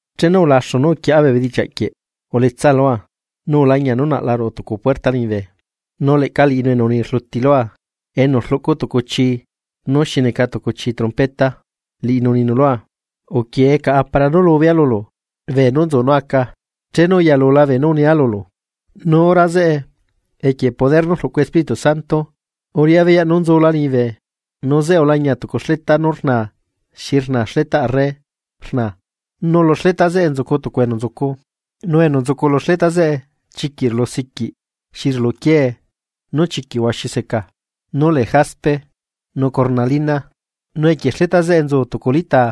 Chenu ulaxu nú uquieꞌa bee bedichiaꞌ quieꞌ uletsa lua nu ulañia nú naꞌla ruꞌu tucu puerta liñibe. Nu leꞌca Liꞌinu enu uni rluti lua enu rluꞌcu tucu chii nú xi neca tucu chi trompeta, Liꞌinu uninu lua: ―Uquie caꞌa para nú lubea lulu beenú nzu nú aca, chenu uyalula beenú unila lulu. Nu hora zeꞌe equie poder nú rluꞌcu Espíritu Santo, uriꞌá beyaꞌ nú nzula liñibe nu zeꞌe ulañia tucu xleta nú rnaa xi rnaa xletaꞌ arre rna nu lu xleta zeꞌe nzucu tucu enu nzucu. Nu enu nzucu lu xleta zeꞌe chiquiꞌ rulusiquiꞌ xi rulu quiee nú chiquiꞌ huaxi seca, nú lee jaspe nu cornalina. Nu equie xleta zeꞌe nzu tucu litaa,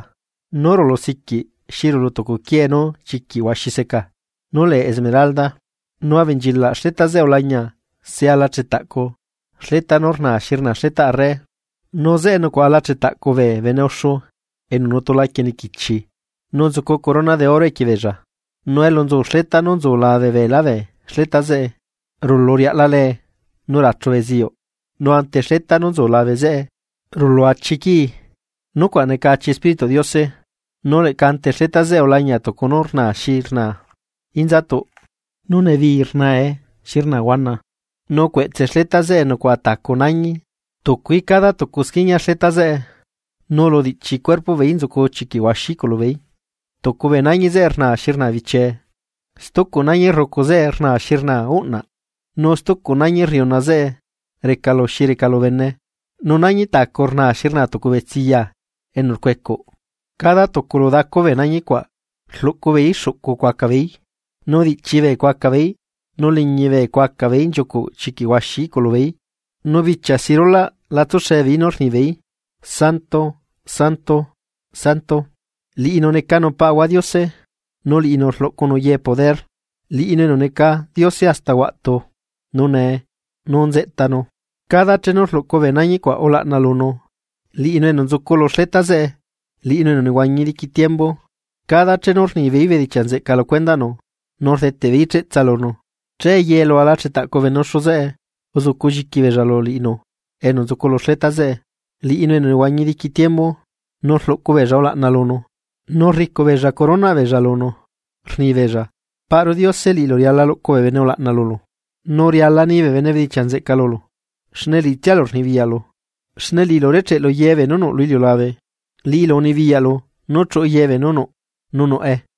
nú rulu siquiꞌ xi rulu tucu quiee nú chiquiꞌ huaxi seca, nú lee esmeralda. Nu abenchilaꞌ xleta zeꞌe ulañia se ala chetaꞌcu xleta nú rnaa xi rnaa xletaꞌ arre, nu zeꞌe nucuaꞌa ala chetaꞌcu bee bene uxu enu nutu laquie niquichi nu nzucu corona de oro equie beella. Nu elu nzu xleta nú nzu labe beelá bee xleta zeꞌe rulu riaꞌla lee nu rachu beziyuꞌ nu ante xleta nú nzu labe zeꞌe rulu achi quii, nucuaꞌ neca achi Espírituꞌ Diose. Nu leꞌca ante xleta zeꞌe ulañia tucu nú rnaa xi rnaa inzatuꞌ nu nebii rnae xi rnaa huana. Nu cueꞌtse xleta zeꞌe nucuaꞌa tacu nañi, tucuí cada tucu squiñia xleta zeꞌe nu lu diꞌchi cuerpoꞌ beeí nzucu chiquiꞌ huaxi iꞌculubeeí. Tucu bee nañi zeꞌe rnaa xi rnaa bichie, stucu nañi rrucu zeꞌe rna xi rnaa uꞌnaꞌ, nu stucu nañi rriuna zeꞌe reca lu xi reca lu bene, nu nañi tacu rnaa xi rna tucu betsiya enu rcuecuꞌ. Cada tucu lu dacu bee nañi cuaꞌ rluꞌcu beeí xuꞌcu cuaca beei, nu diꞌchi bee cuaca beeí, nu liñi bee cuaca beeí nchiucuꞌ chiquiꞌ huaxi iꞌculu beeí. Nu bichia si rulaꞌ la tsuxe beeí nú rni beeí: Santo, santo, santo, Liꞌinu necanu Paꞌahua Diose, nu liꞌinu rluꞌcunu ye poder, Liꞌinu enu neca Diose hasta huaꞌtu, nu nee, nu nzeꞌtanu. Cada chenu rluꞌcu bee nañi cuaꞌ ulaꞌna lunu, Liꞌinu enu nzucu lu xleta zeꞌe, Liꞌinu enu nehuañi diqui tiembu, cada chenu rnibeeí bedichiaꞌ nzeꞌca lu cuendaꞌnu nu rdeteꞌbeeí cheꞌtsa lunu, che ye lu ala chetaꞌcu bee bene uxu zeꞌe uzuculliqui beella lu Liꞌinu enu nzucu lu xleta zeꞌe, Liꞌinu enu nehuañi diqui tiembu, nu rluꞌcu beella ulaꞌna lunu, nu rricuꞌ beella coronaꞌ beella lunu, rnibeella: Paꞌru Diose liꞌilu riala luꞌcu bee bene ulaꞌna lulu, nu riala ni bee bene bedichiaꞌ nzeꞌca lulu, liꞌitsialu rnibiyaꞌlu, xne liꞌilu urecheꞌlu ye beenú nuꞌ lu iliulabe, Liꞌilu unibiyaꞌlu nú chuꞌu ye nú nuꞌ, nu nuꞌe.